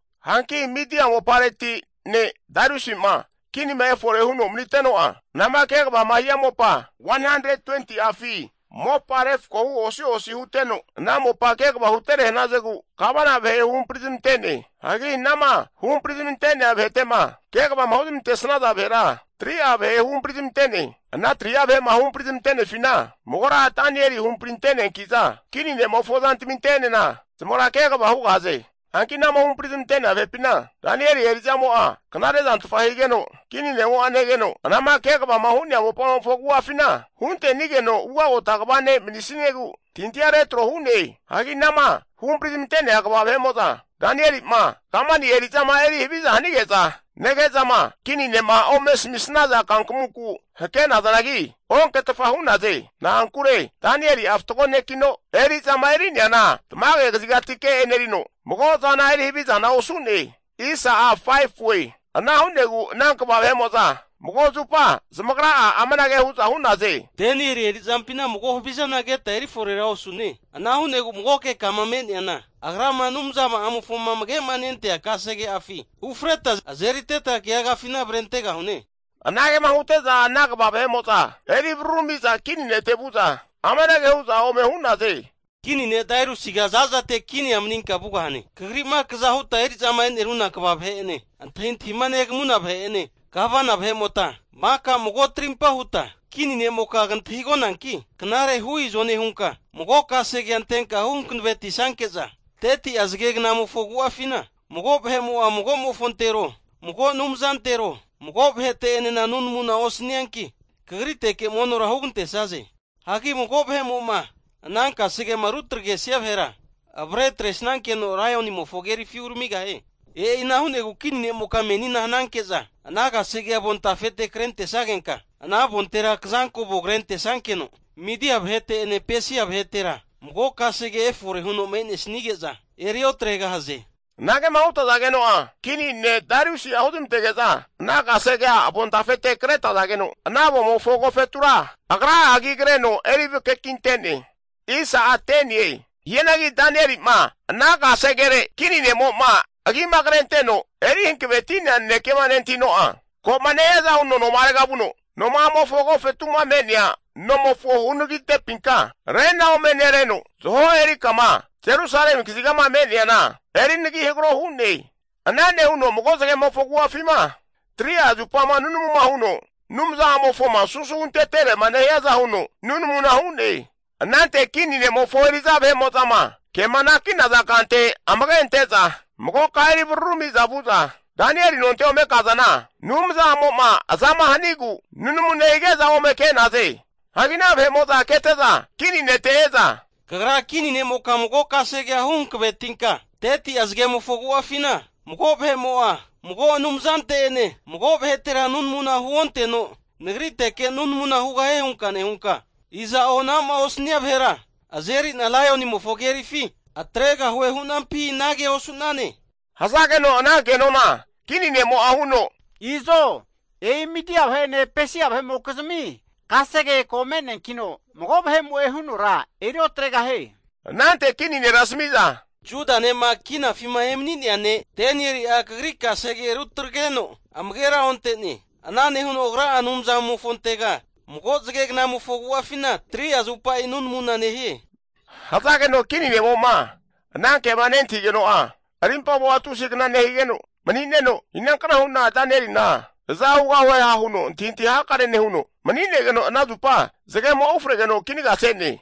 Hanki Midia mopareti ne' Dariusi'ma kinima efore huno maniteno'a, anama kegavama hia mopa 120'afi mopa refakohu osi osi huteno, ana mopa kegava hutere hanazegu gavana vahe huhampri zamante'ne. Hagi anama huhampri zamante'nea vahete'ma kegavama huzmantesnaza vahera 3'a vahe huhampri zamante'ne. Ana 3'a vahe'ma huhampari zamante'nefina magora Danieli huhampari ante'neanki'za, kini ne'mofo zantaminte'enena zamagra kegava hugahaze. Hanki anama huhampri zamante'nea vahepina Danieli eri'zamo'a knare zantfa higeno, kini ne'mo'a negeno anama kegavama hu'nea mopamofo agu'afina hunte'nigeno ugota kva ne' manisniegu antahintahi retro hu'ne. Hagi anama huhampri zamante'nea kva vahe'mo'za, Danieli'ma kamani eri'zama eri haviza hanige'za nege'zama kini ne'ma ome asamisnaza kankamunku hake'nazanagi, onketfa hu'naze. Na'ankure Danieli'a fatgo nekino, eri'zama eri'neana tamage kazigatike e'nerino, mago zana eri havizana osu'ne. Ana hu'negu ana kva vahe'mo'za mago zupa zamagra'a amanage hu'za hu'naze. Danieli eri'zampina mago havizana keta eri forera osune. Ana hu'negu magoke kama me'neana, agrama Anumza'amofoma amage'ma nentea kasege'afi ufreta azeriteta keagafina avrentegahune. Anagema hute'za ana kva vahe'mo'za eri vararumi'za kini nete vu'za, amanage hu'za ome hu'naze. Kini ne' Dariusiga za'zate kinia maninka vugahane! Kagri'ma kaza huta eri'zama e'neruna kva vahe'ene, antahintahima negamuna vahe'ene, gavana vahe'mota maka mago trimpa huta, kini ne'moka kantahigonanki, knare hu izo nehunka mago kasege antenka huhankavetisnanke'za, 30'a zage gnamofo agu'afina mago vahe'mo'a, mago'mofontero, mago anumzantero, mago vahete'enena nunamuna osanianki, kagriteke monora hugantesaze. Hagi mago vahemo'ma ana kasegema rutagresia vahera avre atresnankeno laionimofo kerifi uramigahie. E'ina hu'negu kini ne'moka menina hananke'za ana kasegea avontafete kretesnagenka, ana avontera kazanko avona krentesnankeno, Midia vahete'ene Pesia vahetera mago kasege efore huno me'nesnige'za eri otregahaze. Anagema hutazageno'a kini ne' Dariusi'a huzmantege'za ana kasegea avontafete kretazageno, ana avomofo agofetura agra'a agi kreno eri vakakinte'ne. Hianagi Danieli'ma ana kasegere kini ne'mo'ma agima krenteno eri hankavetia nanekema nentahino'a, koma nehiaza huno noma'arega vuno, noma'amofo agofetu'ma me'nea nomofo hunaragintepinka rena ome nereno, zaho eri kama Jerusalemi kazigama me'neana eri nagi hagaro hu'ne. Ana nehuno mago zagemofo agu'afima 3'a zupama nunamuma huno Anumza'amofoma susu huntetere'ma nehiaza huno nunamuna hu'ne. Anante kini ne'mofo eri'za vahe'mo'zama kema anaki'naza kante amage ante'za magoka eri vararumi'za vu'za Danieli nonte ome kazana, Anumza'amo'ma azama haninogu nunamu nehige'za ome ke'naze. Hagi ana vahe'mo'za kete'za kini nete e'za, Kagra kini ne'moka mago kasegea huhankavetinka, 30'a zagemofo agu'afina mago vahe'mo'a mago anumzante'ene mago vahetera nunamuna huonteno nagriteke nunamuna hugahie hunka nehunka, iza'o anama osania vahera azeri'na laionimofo kerifi atregahue hunka hunampi anagea osu'nane? Hazageno ana kenona kini ne'mo'a huno, Izo e'i Midia vahe'ene Pesia vahe'mokizmi kasege ko me'neankino, mago vahe'mo'e hunora eri otregahie. Anante kini nera asami'za, Juda ne'ma kinafima emani'nea ne' Danieli'a kagri kasegea rutagreno amagera onte'ne. Ana nehuno agra'a Anumzamofontega mago zagegnamofo agu'afina 3'a zupa nunamuna nehie. Hazageno kini ne'mo'ma ana kema nentahigeno'a arimpamo'a tusi kna nehigeno mani'neno, inankna hu'na Danielina aza hugahueha huno antahintahi hakare nehuno, mani'negeno ana zupa zagemo'a ufregeno kinaga se'ne.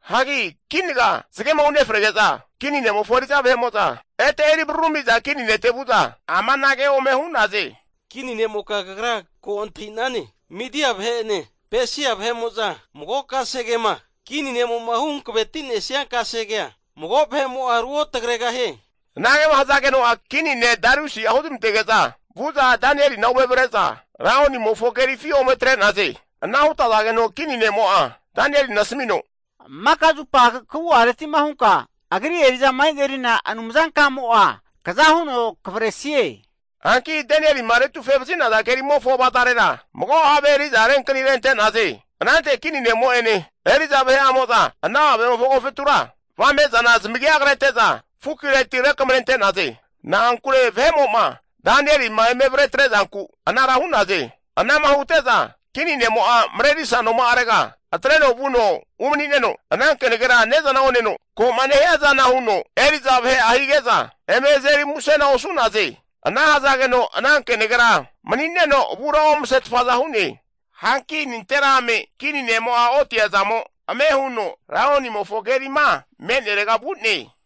Hagi kinaga zagema unefrege'za kini ne'mofo eri'za vahe'mo'za ete eri vararumi'za kini nete vu'za amanage ome hu'naze. Kini ne'moka kagra ko antahi'nane, Midia vahe'ene Pesia vahe'mo'za mago kasegema kini ne'mo'ma huhankaveti'nesnia kasegea mago vahe'mo'a ruotagregahie. Anagema hazageno'a kini ne' Dariusi'a huzmantege'za vu'za Danielina ome avre'za laionimofo kerifi ome atre'naze. Ana hutazageno kini ne'mo'a Danielina asamino, Maka zupa kagu'areti'ma hunka agri eri'zama enerina Anumzankamo'a kaza huno kavresie. Hanki Danielima retufe vazi'naza kerimofo avazarera mago have eri'za renkani rente'naze. Anante kini ne'mo'ene eri'za vahe'amo'za ana havemofo agofetura avame'zana zamagia krete'za fukireti rekamarente'naze. Na'ankure vahe'mo'ma Danielima eme avre atre'zanku anara hu'naze. Ana'ma hute'za kini nemo'a marerisa nonkuma'arega atreno vuno umani'neno, ana kenagera ne'zana oneno, ko'ma nehiazana huno eri'za vahe'a hige'za eme azeri musena osu'naze. Ana hazageno ana kenagera mani'neno avura omasetfa hu'ne. Hanki nanterame kini nemo'a otiazamo, ame huno laionimofo kerima me'nerega vu'ne.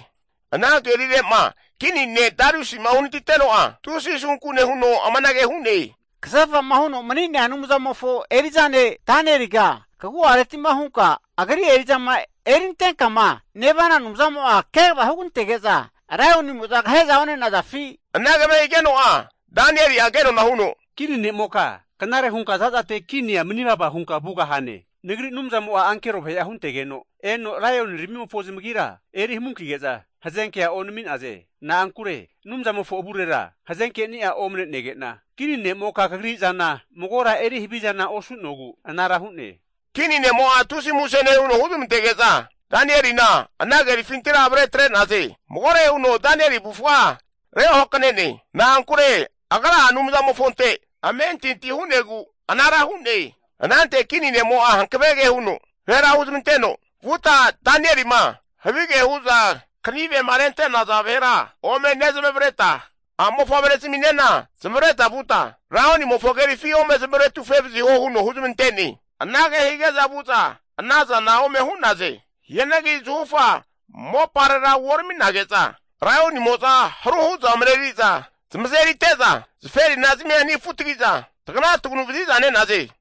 Ana kerire'ma kini ne' Dariusi'ma uhanatiteno'a, tusi asunku nehuno amanage hu'ne. Kasefa'ma huno mani'nea Anumzamofo eri'za ne' Danieliga, kagu'areti'ma hunka agri eri'zama erintenkama nevana Anumzamo'a kegava hugantege'za laionimo'za kahe'za one'nazafi? Anagema higeno'a Danieli'a kenona huno, Kini nemoka knare hunka za'zate kinia mani vava hunka vugahane! Nagri Anumzamo'a ankero vahe'a huntegeno eno laioniramimofo zamagira eri hamunkige'za hazenkea onami'naze. Na'ankure Anumzamofo avurera hazeke'ni'a omanege'na, kini nemoka kagri zana magora eri havizana osu'nogu anara hu'ne. Kini ne'mo'a tusi muse nehuno huzmantege'za, Danielina ana kerifintira avre atre'naze. Magore huno Danieli avufga reohakanene. Na'ankure agra'a Anumzamofonte amentinti hu'negu anara hu'ne. Anante kini nemo'a hankavege huno vahera huzmanteno, Vuta Danielima havige hu'za kanivema rente'naza vahera ome nezamavareta, a'mofavre zaminena zamavareta vuta laionimofo kerifi ome zamaretufe vaziho huno huzmante'ne. Anage hige'za vu'za anazana ome hu'naze. Hianagi zahufa moparera uorami'nage'za, laionimo'za haru hu'za mareri'za zamazerite'za zaferi'nazamia anifunetagi'za taganataganu vaziza nenaze.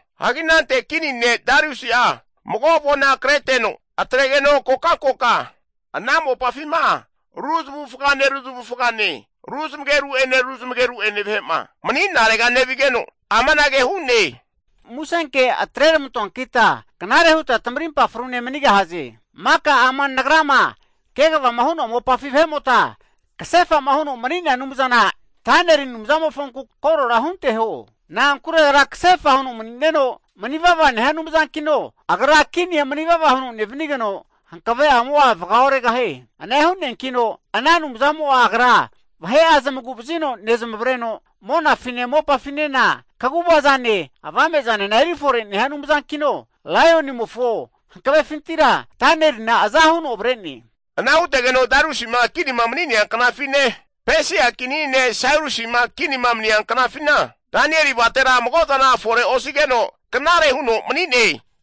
Hagi anante kini ne' Dariusi'a mago avona kreteno, atregeno kokankoka ana mopafima ru zamavufagane ru zamavufagane ru zamageru'ene ru zamageru'ene vahe'ma mani'narega nevigeno amanage hu'ne, musenke atre ramantoankita knare huta tamarimpa frune manigahaze. Maka ama nagrama kegavama hu'noa mopafi vahe'mota kasefa'ma huno mani'nea Anumzana Danieli Anumzamofonku korora hunteho. Na'ankure kasefa huno mani'neno, manivava nehia Anumzankino, agra kinia manivava huno nevanigeno, hankave'amo'a vaga oregahie. Ana hu'neankino ana Anumzamo'a agra vahe'a zamagu vazino nezmavreno, monafine mopafinena kaguva zane avame'zanena eri fore nehia Anumzankino, laionimofo hankavefintira Danielina aza huno avre'ne. Ana hutegeno Dariusi'ma kinima mani'nea knafine, Pesia kini ne' Sairusi'ma kinima mania knafina, Danieli avatera mago zana fore osigeno knare huno mani'ne.